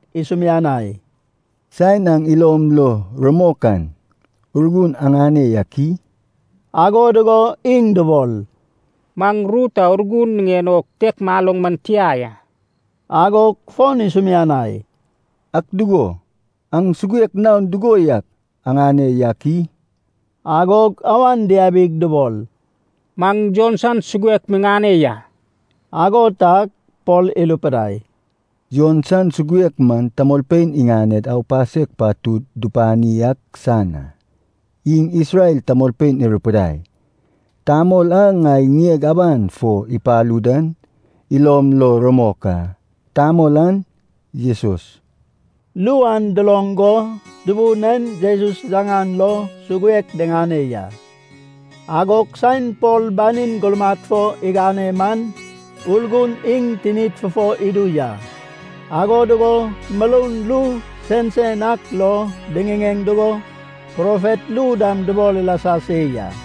isumianai, “Saen aŋ ilom lo rumok an Urgun aŋane yak i?” Ago dugo iŋ dubol, “Maŋ ru ta Urgun niŋen o kitek maloŋ man tia ya.” Agog fon isumianai, “Ak dugo, aŋ suguek naon dugo yak aŋane yak i?” Agog awan diabig, dubol “Maŋ Jon san suguek miŋane ya.” Ago tag Pol irupidai, “Jon san suguek man tamolpein iŋaned aupasek patud dupani ak san a. Iŋ Isrel tamolpein irupidai, ‘Tamol a ŋai ŋieg aban fo ipalu dan ilom lo rumok a. Tamol an Jesus.’” Ru an duloŋ go Tubun en Jesus yaŋan lo suguek diŋane ya. Agog saen Pol banin gurmad fo igane man, Urgun iŋ tinid fufo idu ya, ago dugo muroun ru sensen ak lo diŋiŋeŋ dugo, profet ru dam dubol ilasa se ya.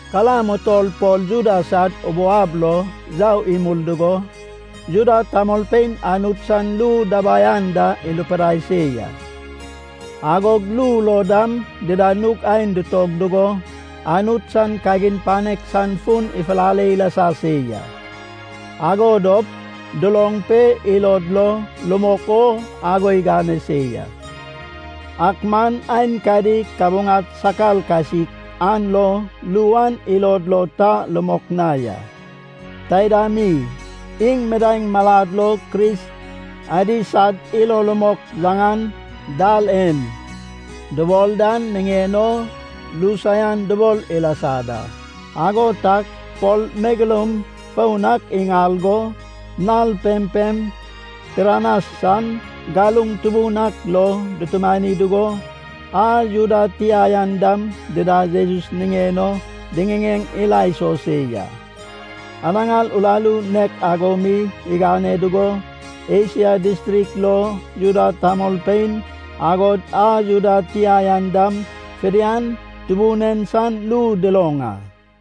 Kalam utol Pol Juda sad ubou ab lo yau imul dugo Juda tamolpein Anut san ru dabai anda irupidai se ya. Agog ru lo dam dida nug aen ditog dugo Anut san kagin panek san fun ifulale ilasa se ya. Ago dop duloŋ pe ilod lo rumok o ago igane se ya. Ak man aenkadi kabuŋad sakar kasik an lo ru an ilod lo ta rumok na ya. Taida mi iŋ midaeŋ malad lo Kris adi sad ilo rumok yaŋan “Dal En” dubol dan niŋen o ru saian dubol ilasa da. Ago tag Pol megeloum foun ak iŋal go, nal pempem Tiranas san galuŋ tubun ak lo dutumani dugo, a Juda tia yan dam dida Jesus niŋen o diŋiŋeŋ ila iso se ya. Anaŋar uraru nek ago mi igane dugo, Esia distrik lo Juda tamolpein, agod a Juda tia yan dam fidian Tubun en san ru duloŋ a.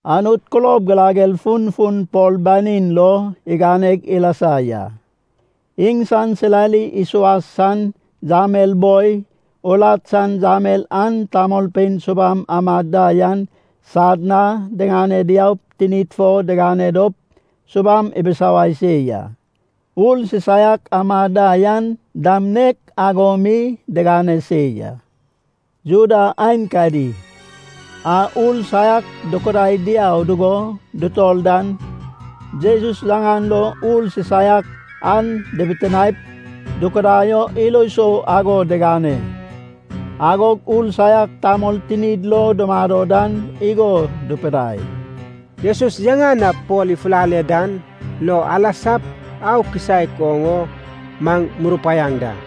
Anut kulob girager funfun Pol banin lo iganeg ilasa ya. Iŋsan silali isuas san yamel boi, urat san yamel an tamolpein subam amad da yan sad na diŋane diaup tinid fo digane dop subam ibisawai se ya. Ur sisaiak amad da yan dam nek ago mi digane se ya. Juda aenkadi a ur saiak dukudai diau dugo dutor dan, Jesus yaŋan lo ur sisaiak an dibitinaep dukudai o ilo sou ago digane. Agog ur saiak tamol tinid lo dumado dan igo dupidai, “Jesus yaŋan a Pol ifulale dan lo alasap au kisaek oŋ o maŋ murupaiaŋ da.”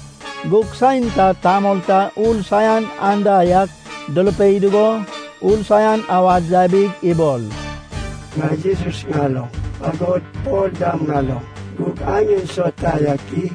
Gug saen ta tamol ta ur saian anda yak durupei dugo, ur saian awad yabig ibol, “Ŋai Jesus ŋaloŋ. Agod Pol dam ŋaloŋ. Gug aŋ en sauta yak i?”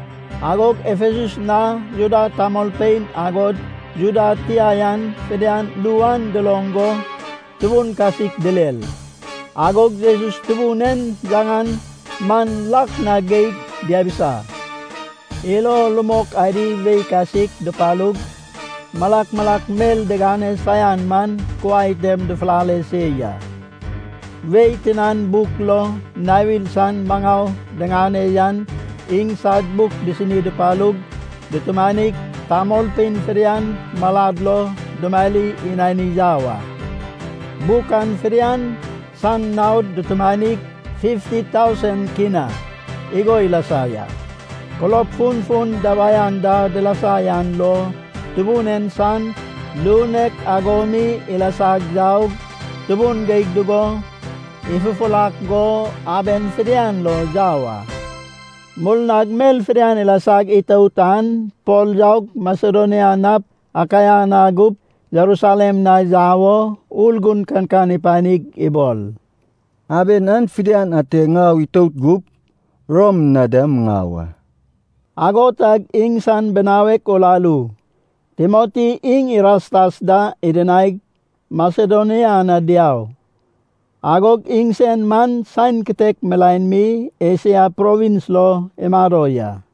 Agog Efesus na Juda tamolpein, agod Juda tia yan fidian ru an duloŋ go tubun kasik direr. Agog Jesus Tubun en yaŋan man lak na geig diabisa. Ilo rumok adi wei kasik dupalug, malak malak mel digane saian man kuai tem dufulale se ya. Wei tinan buk lo nawir san maŋau diŋane yan iŋsad buk disini dupalug dutumanig, tamolpein fidian malad lo dumari inani yau a. Buk an fidian san naod dutumanig, fifti tausen kina (K50,000) igo ilasa ya. Kulob funfun dabai anda dilasa yan lo, Tubun en san ru nek ago mi ilasag yaug tubun geig dugo, ifufurak go aben fidian lo yau a. Murnag mel fidian ilasag itout an, Pol yaup Masedonia nap Akaia na gup Jerusalem na yau o Urgun kankan ipanig ibol, “Aben an fidian ate ŋau itout gup, Rom na dam ŋau a.” Ago tag iŋsan binawek uraru Timoti iŋ Irastas da idinaig, Masedonia na diau. Agog iŋsen man saen kitek milaen mi Esia provins lo imado ya.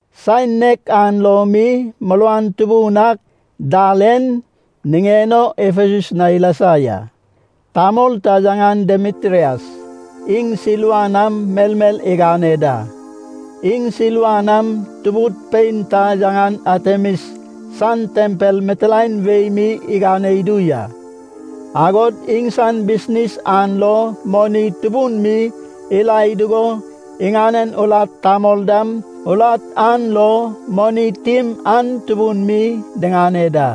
Saen nek an lo mi muruan tubun ak “Dal En” niŋen o Efesus na ilasa ya. Tamol ta, yaŋan Demitrias, iŋ silva nam melmel igane da. Iŋ silva nam tubud pein ta yaŋan Atemis san tempel mitilaen wei mi igane idu ya. Agod iŋsan bisnis an lo moni tubun mi irae dugo, iŋanen urat tamol dam urat an lo moni tim an tubun mi diŋane da.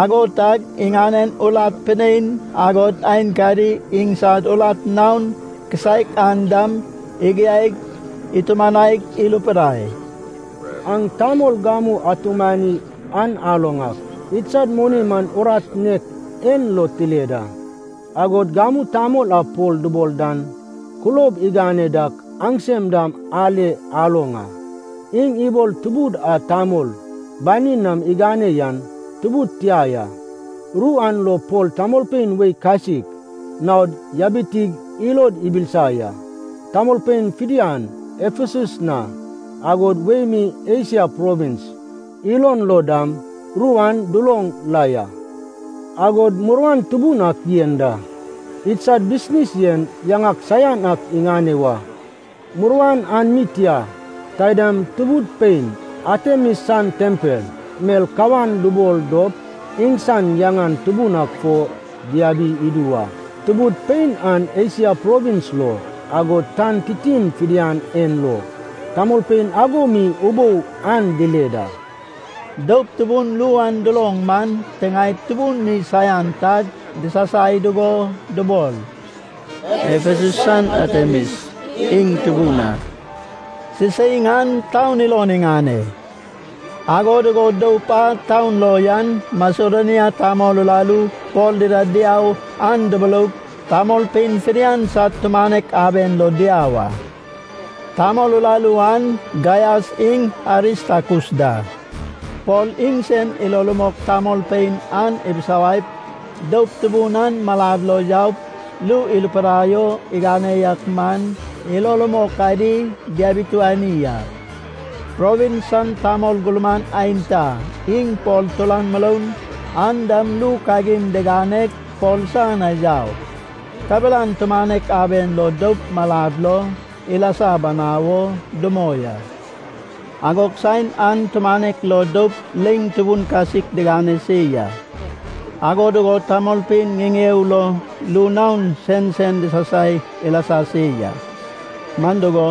Ago tag iŋanen urat pinein agod aenkadi iŋsad urat naon kisaek an dam igiaig itumanaig irupidai, “Aŋ tamol gamu atumani an aloŋ ak, idsad moni man urat nek en lo tile da. Agod gamu tamol a Pol dubol dan kulob igane dak aŋsem dam ale aloŋ a. Iŋ ibol, tubud a tamol banid nam digane yan tubud tia ya. Ru an lo Pol tamolpein wei kasik naod yabitig ilod ibilisa ya. Tamolpein fidian Efesus na, agod wei mi Esia provins ilon lo dam, ru an duloŋ la ya. Agod muruan tubun ak yen da. Idsad bisnis yen yaŋak saian ak iŋane wa. Muruan an mi tia. Taidam tubud pein Atemis san tempel mel kawan dubol dop iŋsan yaŋan tubun an fon diabi idu wa. Tubud pein an Esia provins lo, agod tan titin fidian en lo tamolpein ago mi ubou an dile da.” Doup tubun ru an duloŋ man tiŋaed tubun mi saian tag disasai dugo dubol, “Efesus san Atemis iŋ tubun a.” Siseiŋ an taun ilon iŋane. Ago dugo doup a taun lo yan Masedonia tamol uraru Pol dida diau an duburoug, tamolpein fidian sad tumanek aben lo diau a. Tamol uraru an Gaias iŋ Aristakus da. Pol iŋsen ilo rumok tamolpein an ibisawaip, doup tubun an malad lo yaup, ru irupidai o igane yak man, ilo rumok adi diabituani a. Provins san tamol gurman aenta, iŋ Pol turan muroun, an dam ru kagin diganeg Pol san na yau. Kabelan tumanek aben lo doup malad lo ilasa banau o dumoi a. Agog saen an tumanek lo doup leiŋ tubun kasik digane se ya. Ago dugo tamolpein ŋiŋeo lo ru naon sensen disasai ilasa se ya. Man dugo,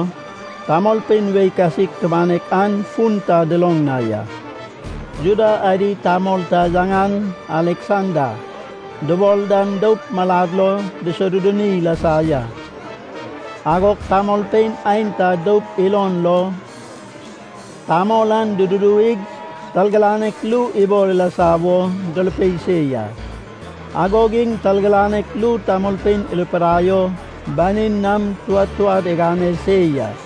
tamolpein wei kasik tumanek an fun ta duloŋ na ya. Juda adi tamol ta yaŋan Aleksanda dubol dan doup malad lo dusoduduni ilasa ya. Agog tamolpein aenta doup ilon lo tamol an dududuwig targiranek ru ibol ilasa wo durupei se ya. Agog iŋ targiranek ru tamolpein irupidai o banin nam touad touad igane se ya.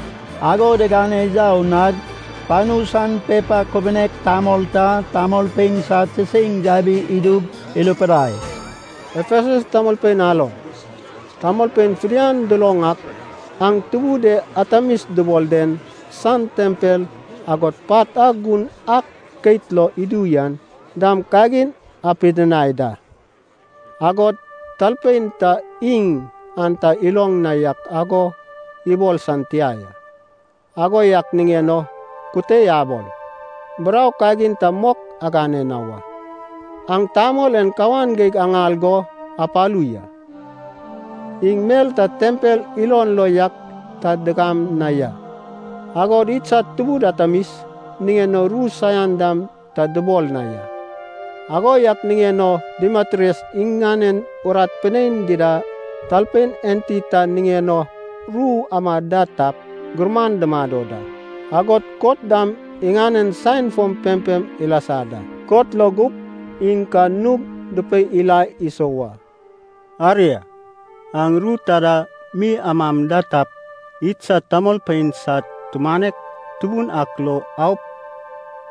Ago digane yau nag panu san pepa kubunek tamol ta tamolpein sad siseiŋ yabi idug irupidai, “Efesus tamolpein aloŋ! Tamolpein fidian duloŋ ak, aŋ tubud e Artemis dubol den san tempel, agod pat a gun ak keit log idu yan dam kagin apidinai da. Agod talpein ta iŋ an ta iloŋ na yak ago ibol san tia ya. Ago yak niŋen o kute abol. Burau kagin ta mok agane na wa. Aŋ tamol en kawan geig aŋal go apalu ya. Iŋ mel ta tempel ilon lo yak ta digam na ya. Agod idsad tubud Atemis niŋen o ru saian dam ta dubol na ya. Ago yak niŋen o Demitrias iŋanen urat pinein dida talpein enti ta niŋen o ru amad da tap, gurman dumado da. Agod kot dam iŋanen saen fom pempem ilasa da. Kot lo gup iŋ ka nug dupei ila iso wa. Aria, aŋ ru taida mi amam da tap, idsad tamolpein sad tumanek tubun ak lo aup,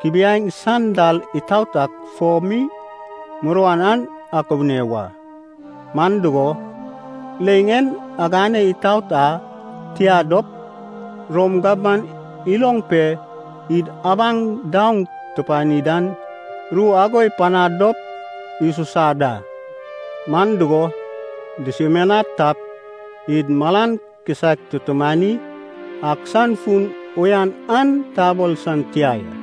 kubiaeŋ san dal itaot ak fo mi muruan an akubune wa. Man dugo, leiŋ en agane itout a, tia dop Rom gabman iloŋ pe, id abaŋ daoŋ tupani dan, ru ago ipanad dop isusad a. Man dugo, dusumianad tap, id malan kisaek tutumani ak san fun uyan an tabol san tia ya.”